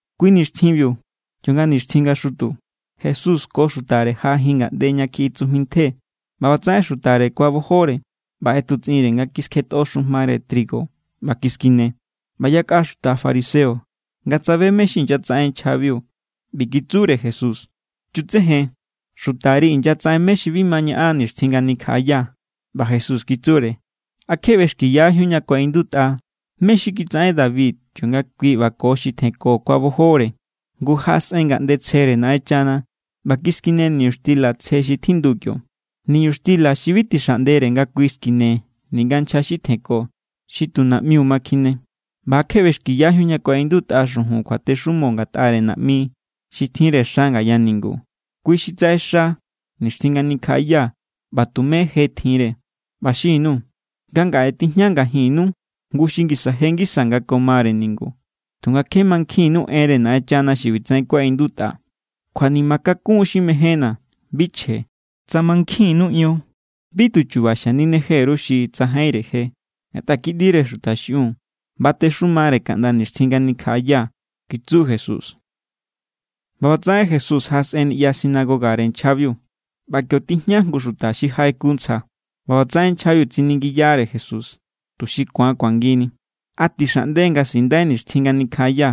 Kui nixtjinbiu kionga nixtjin nga xutu, Jesús ko xutare jaꞌajin ngaꞌnde ña kjiꞌi tsujmi ntje. ꞌBa ꞌbatsaꞌen xutare kuabojore ꞌba ꞌetutsꞌinre nga kiskjetꞌo xujmare trigo ꞌba kiskine. ꞌBa yakꞌa xuta fariseo nga tsabe mé= xi inyatsaꞌen nchjabiu, ꞌbi kitsure Jesús: —Chutsejen. Xutari inyatsaꞌen mé= xi bi ma ñaꞌan nixtjin nga nikjaꞌaya. ꞌBa Jesús kitsure: —¿A kje ꞌbexkiyajíun ña kuaꞌindutꞌa mé= xi kitsaꞌen David, kionga kui ꞌba ko xi tjenko kuabojore? Ngu jaꞌasꞌen ngaꞌnde tsjere Naꞌenchana ꞌba kiskine niñuxtila tsje xi tjindu kio, niñuxtila xi bi tixaꞌndere nga kui skine ninga nchja xi tjenko, xi tu naꞌmiu ma kjine. ¿ꞌBa a kje ꞌbexkiyajíun ña kuaꞌindutꞌa xujun kjuatexumo ngatꞌare naꞌmi xi tjinre xa ngaya ningu? Kui xi tsaꞌexa nixtjin nga nikjaꞌaya ꞌba tume je tjinre. ꞌBa xin_nuu̱ nga ngaꞌe tijña ngajinnu jngu xi ngisa je ngisa nga ko mare ningu. Tunga kje mankjinnu enre Naꞌenchana xi ꞌbitsaꞌen kuaꞌindutꞌa: “Kjuanima kakun xi mejénna̱, bi chje.” Tsa mankjinnu ion, bi tu chu̱ba̱ xanineje_ru xi tsajainre je. Ngatꞌa Kiꞌndire Xuta xiꞌiun batexumare kaꞌnda nixtjin nga nikjaꞌaya —kitsu Jesús. ꞌBa ꞌbatsaꞌen Jesús jaꞌasꞌen niꞌya sinagogare nchjabiu. ꞌBa kio= tijña jngu xuta xi jaꞌeku ntsja. ꞌBa ꞌbatsaꞌen nchjabiu tsiningiyare Jesús, tuxi ku̱an kuangini: —¿A tixaꞌnde nga sindai nixtjin nga nikjaꞌaya?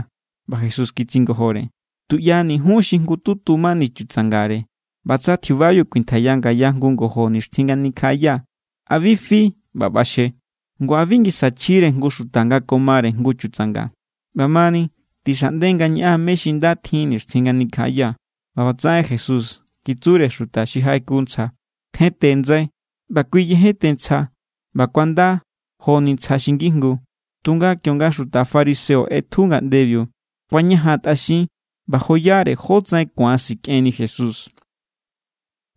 ꞌBa Jesús kitsingojore: —Tuꞌyani jun xi jngututu mani chutsangare, ꞌba tsa tjiubabiu kuintjaiya ngaya jngu ngojo nixtjin nga nikjaꞌaya, ¿a bi fi ꞌba ꞌbaxje? Ngu ¿a bi ngisa chjire jngu xuta nga ko mare jngu chutsanga? ꞌBamani, tixaꞌnde nga ñaꞌan mé= xi nda tjin nixtjin nga nikjaꞌaya. ꞌBa ꞌbatsaꞌen Jesús kitsure xuta xi jaꞌeku ntsja: —Tjente ndsai. ꞌBa kui yejente ntsja, ꞌba kuanda joni ntsja xi ngijngu. Tunga kionga xuta fariseo ꞌetju ngaꞌndebiu kuañajantꞌaxin ꞌba joyare jótsaꞌen ku̱an sikꞌenni Jesús.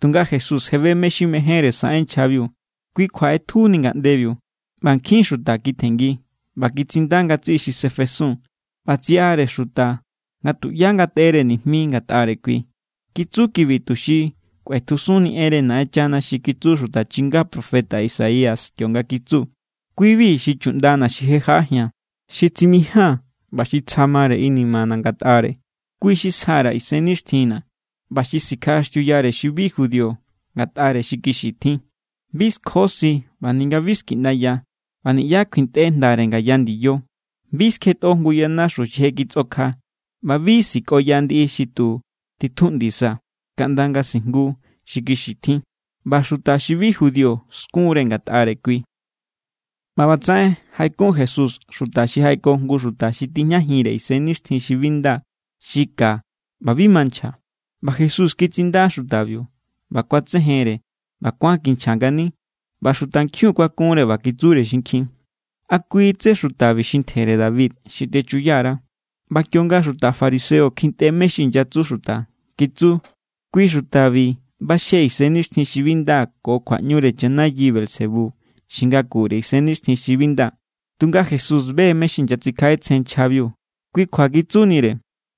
Tunga Jesús je be mé= xi mejénre saꞌen nchjabiu, kui kjua ꞌetjuni ngaꞌndebiu. ꞌBa nkjin xuta kitjenngi, ꞌba kitsinda ngatsiꞌi xi sefesun. ꞌBa tsiꞌare xuta nga tuꞌyá ngateꞌere nijmi ngatꞌare kui. Kitsu kibi tuxi kꞌuetjusunni enre Naꞌenchana xi kitsu xuta chinga profeta Isaías, kionga kitsu: Kui=bi xi chuꞌndana̱ xi je jaꞌajia̱n, xi tsimijaa̱n ꞌba xi tsja mare inimana̱ ngatꞌare. Kui xi sja_ra̱ Isennixtjinna̱, ꞌba sikjaꞌaxtiuyare xi bi judío, ngatꞌare xi kixi tjin. Bi skjosi ꞌba ninga bi skiꞌndaya, ꞌba niꞌyá kjuintꞌe jndare ngaya ndiyo. Bi skjetꞌo jngu yanaxu xi je kitsꞌokja, ꞌba bi sikꞌoya ndiꞌi xi tu titjuꞌndisa, kaꞌnda nga sijngu xi kixi tjin. ꞌBa xuta xi bi judío skunre ngatꞌare kui. ꞌBa ꞌbatsaꞌen jaꞌekun Jesús xuta xi jaꞌeko jngu xuta xi tijñajinre isennixtjin xi bi nda xi ka ꞌba bi ma nchja. ꞌBa Jesús kitsinda xutabiu, ꞌba kuatsejenre ꞌba kuán kinchja ngani. ꞌBa xutankjiun kuakunre ꞌba kitsure xinkjin: —¿A kui= tsé xutabi xi Ntjere David xi techuya_ra? ꞌBa kionga xuta fariseo kjintꞌe mé= xi inyatsu xuta, kitsu: —Kui xutabi ꞌbaxje isennixtjin xi bi nda ko kjuaꞌñure chanayi Beelzebú, xi ngakure isennixtjin xi bi nda. Tunga Jesús be= mé= xi inyatsikjaꞌetsjen nchjabiu, kui kjua kitsunire: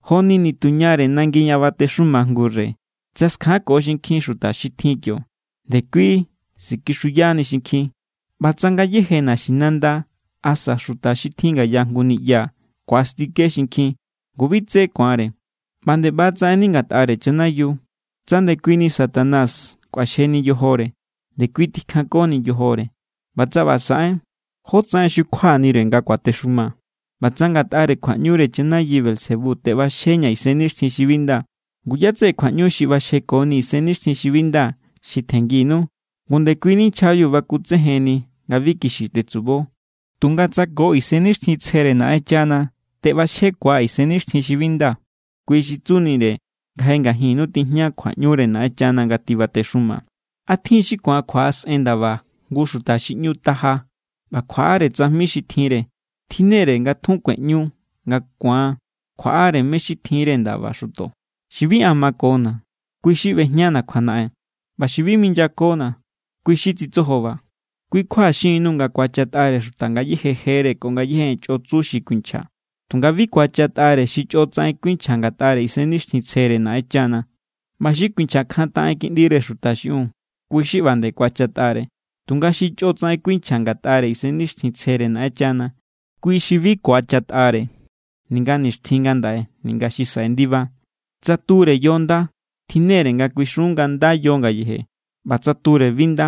—Joni nituñare nangi ña batexuma jngu rey. Tsa skjanko xinkjin xuta xi tjin kio, ndekui sikixuyani xinkjin. ꞌBa tsa ngayéje naxinanda asa xuta xi tjin ngaya jngu niꞌya ku̱astike xinkjin, ngu bi tsé ku̱anre. ꞌBa nde ꞌba= tsaꞌenni ngatꞌare chanayiu. Tsa ndekui Satanás kꞌuaxjeni yojore, ndekui tikjankoni yojore. ꞌBa tsa ꞌba saꞌen, ¿jótsaꞌen xukjuanire nga kuatexuma? ꞌBa tsa ngatꞌare kjuaꞌñure chanayi Beelzebú teꞌbaxjeña̱ isennixtjin xi bi nda, ngu ¿ꞌyá= tseꞌe kjuaꞌñu xi ꞌbaxjekoni isennixtjin xi bi nda xi tjennginu? Ngu ndekui nchjabiu bakutsejenni nga bi kixi tetsubo. Tunga tsa ko Isennixtjintsjere Naꞌenchana teꞌbaxjekuaa̱ isennixtjin xi bi nda, kui xi tsunire nga je ngajinnu tijña kjuaꞌñure Naꞌenchana nga tibatexuma. ’¿A tjin= xi ku̱an kjuaꞌasꞌen ndaba jngu xuta xi ꞌñu taja ꞌba kjuaꞌare tsajmi xi tjinre? Tjinnere nga tjun kueꞌñu nga ku̱an kjuaꞌare mé= xi tjinre ndaba xuto. ’Xi bi an makona̱, kui= xi ꞌbejñana̱ kjuanaꞌen. ꞌBa xi bi minyakona̱, kui= xi tsitsojoba. ’Kui kjua xin_nuu̱ nga ku̱achatꞌare xuta ngayéje jere ko ngayéje en chꞌo tsu xi kuinchja. Tunga bi ku̱achatꞌare xi chꞌo tsaꞌen kuinchja ngatꞌare Isennixtjintsjere Naꞌenchana. ꞌBa xi kuinchjakjantaꞌen Kiꞌndire Xuta xiꞌiun, kui= xi ꞌba nde ku̱achatꞌare. Tunga xi chꞌo tsaꞌen kuinchja ngatꞌare Isennixtjintsjere Naꞌenchana, kui xi bi ku̱achatꞌare ninga nixtjin ngandaꞌe ninga xi saꞌe ndiba. ’Tsa ture yo nda, tjinnere nga kuixun nga nda yo ngayeje. ꞌBa tsa ture bi nda,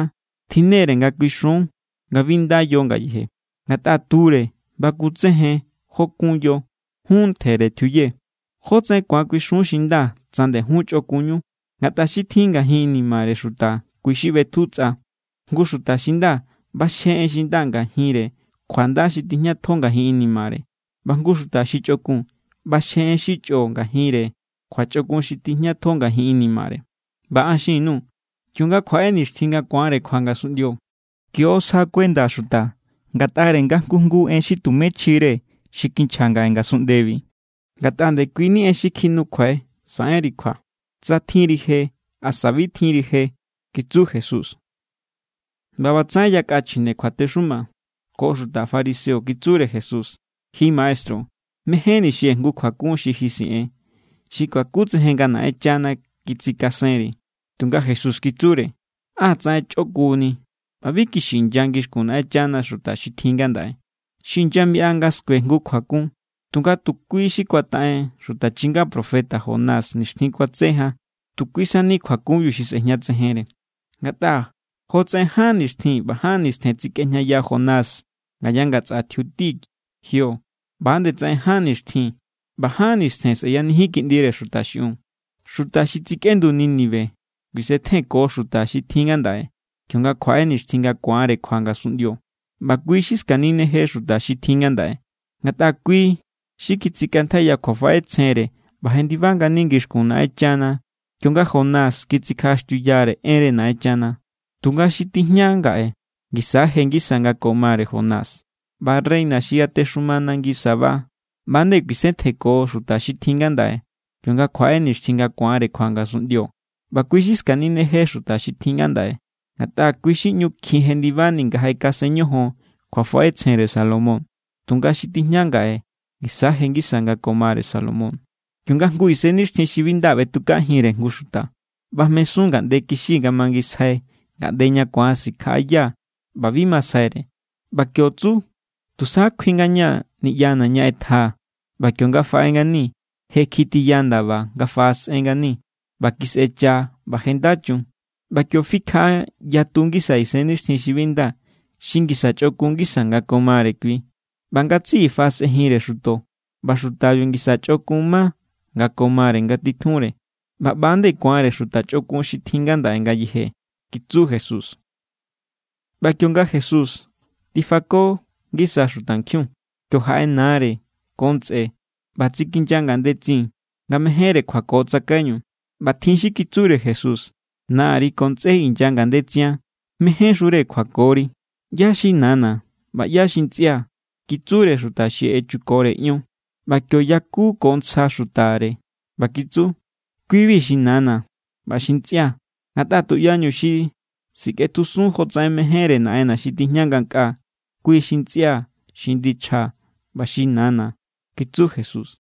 tjinnere nga kuixun nga bi nda yo ngayeje. Ngatꞌa ture bakutsejen jó kun yo. Jun ntjere tjiuye, ¿jótsaꞌen ku̱an kuixun xi nda tsa ndejun chꞌokunñu? Ngatꞌa xi tjin ngajin inimare xuta, kui= xi ꞌbetju tsꞌa. Jngu xuta xi nda ꞌbaxje en xi nda ngajinre kjunda xi tijñatjo ngajin inimare. ꞌBa jngu xuta xi chꞌokun ꞌbaxje en xi chꞌo ngajinre kjuachꞌokun xi tijñatjo ngajin inimare. ꞌBa an xin_nuu̱. Kionga kjuaꞌe nixtjin nga ku̱anre kjua ngasunꞌndio, kio= sja kuenda xuta ngatꞌare nga jngu jngu en xi tume chjire xi kinchja ngaꞌe ngasunꞌndebi. Ngatꞌa ndekui ni en xi kjinukjuai saꞌenri kjua, tsa tjinri je asa bi tjinri je —kitsu Jesús. ꞌBa ꞌbatsaꞌen yakꞌa chjine kjuatexuma ko xuta fariseo kitsure Jesús: —Ji maestru, mejénni̱ xie̱ jngu kjuakun xi ji siꞌen, xi kuakutsejen nga Naꞌenchana kitsikasenri. Tunga Jesús kitsure: —¡Á tsaꞌen chꞌokunni ꞌba bi kixi inya ngixkun Naꞌenchana xuta xi tjin ngandaꞌe! Xi inyamiꞌa nga skue jngu kjuakun, tunga tu kui= xi kuataꞌen xuta chinga profeta Jonás nixtjin kuatse jan, tu kui sani kjuakunbiu xi sꞌejñatsejenre. Ngatꞌa jotsaꞌen ján nixtjin ꞌba ján nistjen tsikꞌejñaya Jonás ngaya ngatsꞌa tjiuti jio, ꞌba=nde tsaꞌen ján nixtjin ꞌba ján nistjen sꞌeyanijin Kiꞌndire Xuta xiꞌiun. Xuta xi tsikꞌendu Nínive kuisetjenko xuta xi tjin ngandaꞌe, kionga kjuaꞌe nixtjin nga ku̱anre kjua ngasunꞌndio. ꞌBa kui= xi skanineje xuta xi tjin ngandaꞌe, ngatꞌa kui= xi kitsikꞌantjaiya kjuafaꞌetsjenre ꞌba jendiba ngani ngixkun Naꞌenchana kionga Jonás kitsikjaꞌaxtiuyare enre Naꞌenchana. Tunga xi tijña ngaꞌe ngisa= je ngisa nga ko mare Jonás. ꞌBa reina xi yatexuma nangi Sabá ꞌba=nde kuisetjenko xuta xi tjin ngandaꞌe, kionga kjuaꞌe nixtjin nga ku̱anre kjua ngasunꞌndio. ꞌBa kui= xi skanineje xuta xi tjin ngandaꞌe, ngatꞌa kui= xi ꞌñu kjin jendibani nga jaꞌekasen ñojon kjuafaꞌetsjenre Salomón. Tunga xi tijña ngaꞌe ngisa= je ngisa nga ko mare Salomón. ’Kionga jngu isennixtjin xi bi nda ꞌbetukajinre jngu xuta, ꞌbajmesun ngaꞌnde kixi nga mangisjai ngaꞌnde ña ku̱an sikjaꞌaya ꞌba bi masjaire. ꞌBa kio tsu: “Tusa kjui ngaña̱ niꞌyana̱ ña ꞌetjaa̱.” ꞌBa kionga faꞌe ngani, je kjitiya ndaba nga faꞌasꞌen ngani, ꞌba kisꞌecha ꞌba je nda chun. ꞌBa kio fikjaꞌa yatu ngisa isennixtjin xi bi nda xi ngisa chꞌokun ngisa nga ko mare kui, ꞌba ngatsiꞌi faꞌasꞌenjinre xuto. ꞌBa xutabiu ngisa chꞌokun ma nga ko mare ngatitjunre. ꞌBa ꞌba=nde ku̱anre xuta chꞌokun xi tjin ngandaꞌe ngayeje —kitsu Jesús. ꞌBa kionga Jesús tifako ngisa xutankjiun, kio jaꞌe nare ko ntsꞌe ꞌba tsikinya ngandetsin nga mejénre kjuako tsakaiñu. ꞌBa tjin xi kitsure Jesús: —Nari ko ntsꞌé inya ngandetsian. Mejénxure kjuakori. —¿ꞌYá= xi nana̱ ꞌba ꞌyá= xi ntsꞌia̱? —kitsure xuta xi echukore ion. ꞌBa kio yaku ko ntsja xutare ꞌba kitsu: —Kui=bi xi nana̱ ꞌba xi ntsꞌia̱. Ngatꞌa tuꞌyañu xi sikꞌetjusun jotsaꞌen mejénre Naꞌenna̱ xi tijña ngankꞌaa, kui= xi ntsꞌia̱, xi ndichjaa̱ ꞌba xi nana̱ —kitsu Jesús.